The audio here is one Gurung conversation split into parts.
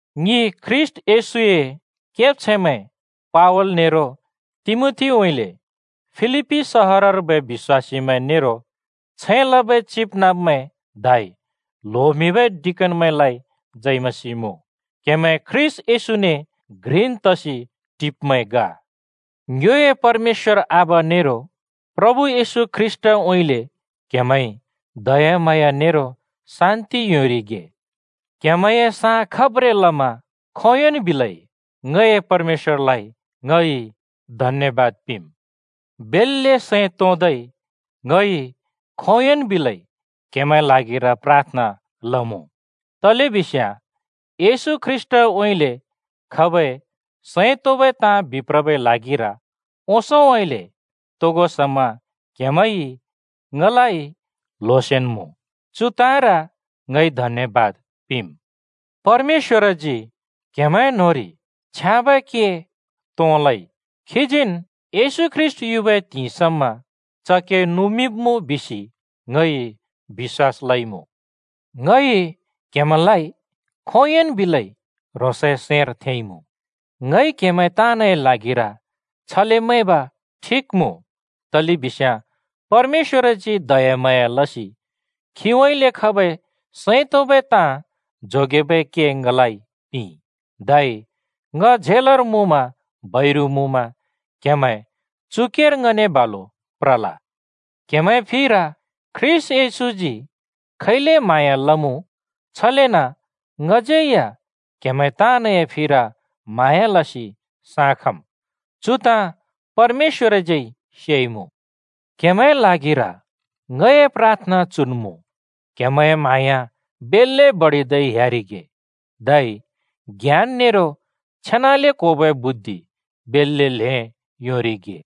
ङि ख्रीष्‍ट येशूए केब्छैंमैं पावल नेरो तिमोथीउँइँले फिलिप्‍पी सहरर्बै बिश्‍वासीमैं नेरो छैं लबै चिबनाँब्मैं धै ल्होमिंबै डिकनमैंलाइ जय मसीह मुँ। क्हेमैं ख्रीष्‍ट येशूने घ्रिन् तसि टिब्मैं ग। ङ्योए परमेश्‍वर आबा नेरो प्रभु येशू ख्रीष्‍टउँइँले क्‍हेमैंइ दयाम्हाँया नेरो शान्‍ति योंरिगे। क्हेमैंए साँ खब्रें लमा खोंयोंन् बिलै ङए परमेश्‍वरलाइ ङइ धन्‍यबाद पिंम्। बेल्‍ले सैं तोंदै ङइ खोंयोंन् बिलै क्‍हेमैंए ल्हागिर प्राथना लमुँ, तलेबिस्याँ येशूउँइँले खबै सैं तोंबै ताँ बिप्रबै ल्हागिर ओंसोंउँइँले तोगो समा क्‍हेमैंइ ङलाइ ल्होसिन् मुँ। चु ताँर ङइ धन्यबाद पिंम्। परमेश्‍वरजी क्हेमैंए न्होंरि छ्याँबै के तों लइ, खीजीन् येशू ख्रीष्‍ट युबै त्हिंइ समा च के नुमिंब्मुँ बिसि ङइ बिश्‍वास लइमुँ। ङइ क्‍हेमैंलाइ खोंयोंन् बिलै ह्रोंसए सैंर थेंइमुँ। ङइ क्हेमैं ताँनए ल्हागिर छले मैंब ठिक मुँ, तलेबिस्याँ परमेश्‍वरजी दयाम्हाँया लसि खीउँइँले खबै सैं तोंबै ताँ जोगेबै के ङलाइ पिंइ, धै ङ झेलर मुँमा बैरु मुँमा क्हेमैं चु केर ङने बालुन् प्रल। क्‍हेमैंए फिर ख्रीष्‍ट येशूजी खैले म्हाँया लमुँ, छलेन ङज्यै या क्‍हेमैं ताँनए फिर म्हाँया लसि साँ खम्। चु ताँ परमेश्‍वरज्यै सेइमुँ। क्‍हेमैंए ल्हागिर ङए प्राथना चुन् मुँ: क्‍हेमैंए म्हाँया बेल्‍ले बडिदै ह्‍यारिगे, धै ज्ञान नेरो छेनाले क्‍होबै बुद्धि बेल्‍ले ल्‍हें योंरिगे।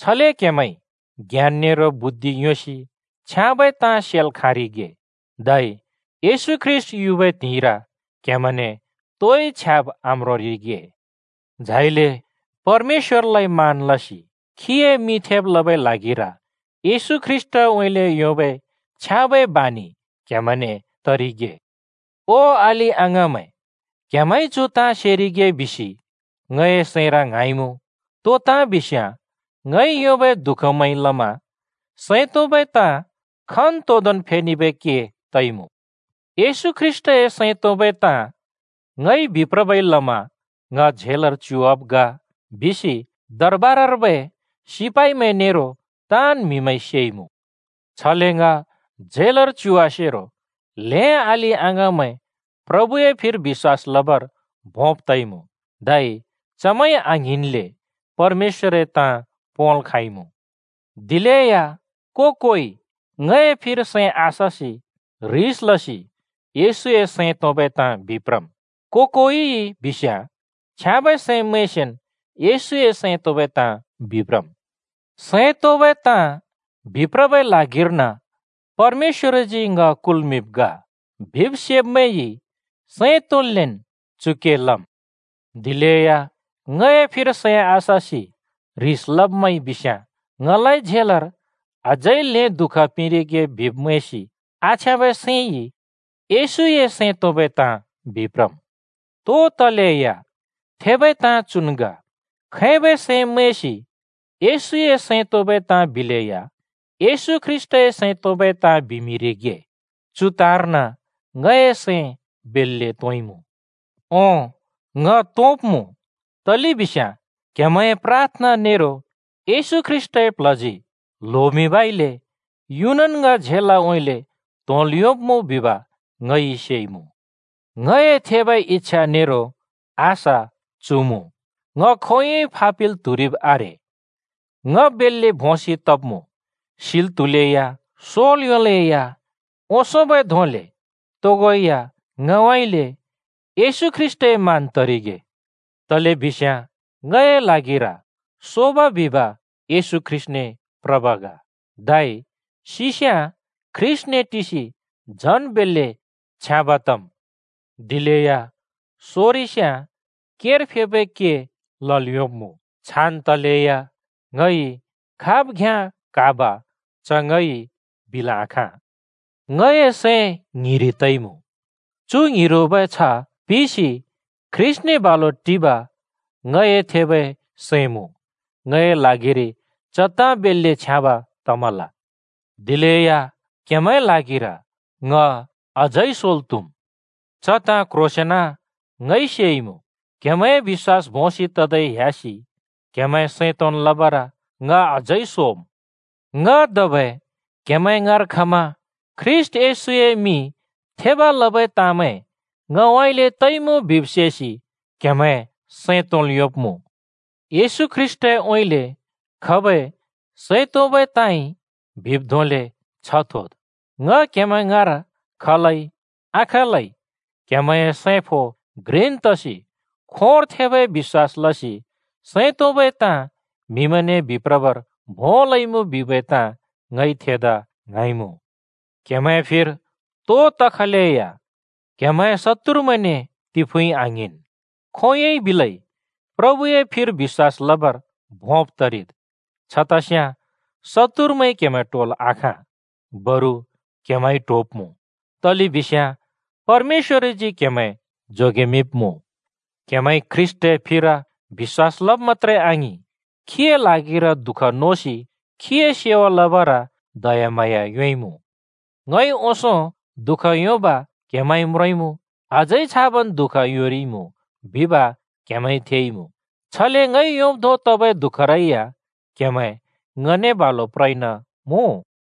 छले क्हेमैंइ ज्ञान नेरो बुद्धि योंसि छ्याँबै ताँ सेल् खाँरिगे, धै येशू ख्रीष्‍ट युबै त्हिंइर क्‍हेमैंने तोइ छ्याब् आम्रोंरिगे। झाइले परमेश्‍वरलाइ मान लसि खीए मिं थेब लबै ल्हागिर येशू ख्रीष्‍टउँइँले योंबै छ्याँबै बानि क्हेमैंने तरिगे। ओ अलि-अङाँमैं, क्‍हेमैंइ चु ताँ सेरिगे बिसि ङए सैंर ङ्हाँइमुँ: तो ताँ बिस्याँ, ङइ योंबै दुःखमैंइ लमा सैं तोंबै ताँ खन्तोंदोंन् फेनेबै के तइमुँ। येशू ख्रीष्‍टए सैं तोंबै ताँ ङइ बिप्रबै लमा ङ झेलर च्युवाब् ग बिसि दरबारर्बै सिपाइमैं नेरो ताँन् म्हिमैंइ सेइमुँ। छले ङ झेलर च्युवासेरो ल्‍हें अलि-अङाँमैं प्रभुए फिर बिश्‍वास लबर भोंब् तइमुँ, धै चमैंइ आङ्हिंनले परमेश्‍वरए ताँ पोंल् खाँइमुँ। दिलेया को-कोइ ङए फिर सैं आससि ह्रिस लसि येशूए सैं तोंबै ताँ बिप्रम्। को-कोइइ बिस्याँ छ्याँबै सैं मैंसिन् येशूए सैं तोंबै ताँ बिप्रम्। सैं तोंबै ताँ बिप्रबै ल्हागिर्न परमेश्‍वरजी ङ कुल्मिंब् ग बिब् सेब्मैंइ सैं तोंन्लेन् चु के लम्। दिलेया ङए फिर सैं आससि ह्रिस लब्मैंइ बिस्याँ, ङलाइ झेलर अझै ल्हें दुःख पिंरिगे बिब् मैंसि आछ्याँबै सैंइ येशूए सैं तोंबै ताँ बिप्रम्। तो तलेया थेबै ताँ चुन् ग: खैबै सैं मैंसि येशूए सैं तोंबै ताँ बिलेया येशू ख्रीष्‍टए सैं तोंबै ताँ बिमिंरिगे, चु ताँर्न ङए सैं बेल्‍ले तोंइमुँ। ओं, ङ तोंब्मुँ, तलेबिस्याँ क्हेमैंए प्राथना नेरो येशू ख्रीष्‍टए प्ल्हजी ल्होमिंबइले युनन् ङ झेलउँइँले त्होंल् योंब्मुँ बिब ङइ सेइमुँ। ङए थेबै इच्छा नेरो आशा चु मुँ: ङ खोंयोंइ फापिल् त्हुरिब् आरे। ङ बेल्‍ले भोंसि तब्मुँ, सिल् त्हुलेया, सोल् योंलेया ओंसोंबै धोंले तोगो या ङउँइँले येशू ख्रीष्‍टए मान तरिगे। तलेबिस्याँ ङए ल्हागिर सोब बिब येशू ख्रीष्‍टने प्रब् ग। धै सिस्‍याँ ख्रीष्‍टने टिसि झन् बेल्‍ले छ्याँब तम्। दिलेया सोरिस्याँ केर फेबै के लल् योंब्मुँ। छान् तलेया ङइ खाब् घ्याँ क्हाब च ङइ बिल आखाँ। ङए सैं ङ्हिरि तइमुँ। चु ङ्हिरोबै छ्ह पिसि ख्रीष्‍टने बालु टिब ङए थेबै सैं मुँ, ङए ल्हागिरि च ताँ बेल्‍ले छ्याँब तमल। दिलेया क्‍हेमैंए ल्हागिर ङ अझै सोल् त्हुम्। च ताँ क्ह्रोंसेंन ङइ सेइमुँ: क्हेमैंए बिश्‍वास भोंसि ततै ह्‍यासि क्हेमैं सैं तोंन् लबर ङ अझै सोम्। ङ धबै क्‍हेमैं ङाँर खमा ख्रीष्‍ट येशूए मिं थेब लबै ताँमैं ङउँइँले तइमुँ बिब् सेसि क्‍हेमैं सैं तोंल् योंब्मुँ। येशू ख्रीष्‍टउँइँले खबै सैं तोंबै ताँइ बिब् धोंले छ्ह थोद्। ङ क्हेमैं ङाँर खलै आखलै क्हेमैंए सैं फो घ्रिन् तसि खोंर थेबै बिश्‍वास लसि सैं तोंबै ताँ म्हिमैंने बिप्रबर भों लइमुँ बिबै ताँ ङइ थेदा ङ्हाँइमुँ। क्हेमैंए फिर तो तखलेया क्हेमैंए शत्तुरमैंने तिफुँइ आङ्हिंन्। खोंयोंइ बिलै प्रभुए फिर बिश्‍वास लबर भोंब् तरिद्। छतस्याँ शत्तुरमैंइ क्हेमैं ट्होल आखाँ, बरु क्‍हेमैंइ ट्होब्‍मुँ, तलेबिस्याँ परमेश्‍वरजी क्‍हेमैं जोगेमिंब्मुँ। क्हेमैंइ ख्रीष्‍टए फिर बिश्‍वास लब मत्‍त्रे आङिं, खीए ल्हागिर दुःख नोसि खीए सेवा लबर दयाम्हाँया योंइमुँ। ङइ ओंसों दुःख योंब क्‍हेमैंइ म्रोंइमुँ, अझै छाबन् दुःख योंरिइमुँ बिब क्हेमैंइ थेइमुँ। छले ङइ योंब् धों तबै दुःखरै या क्‍हेमैं ङने बालु प्रइन मुँ।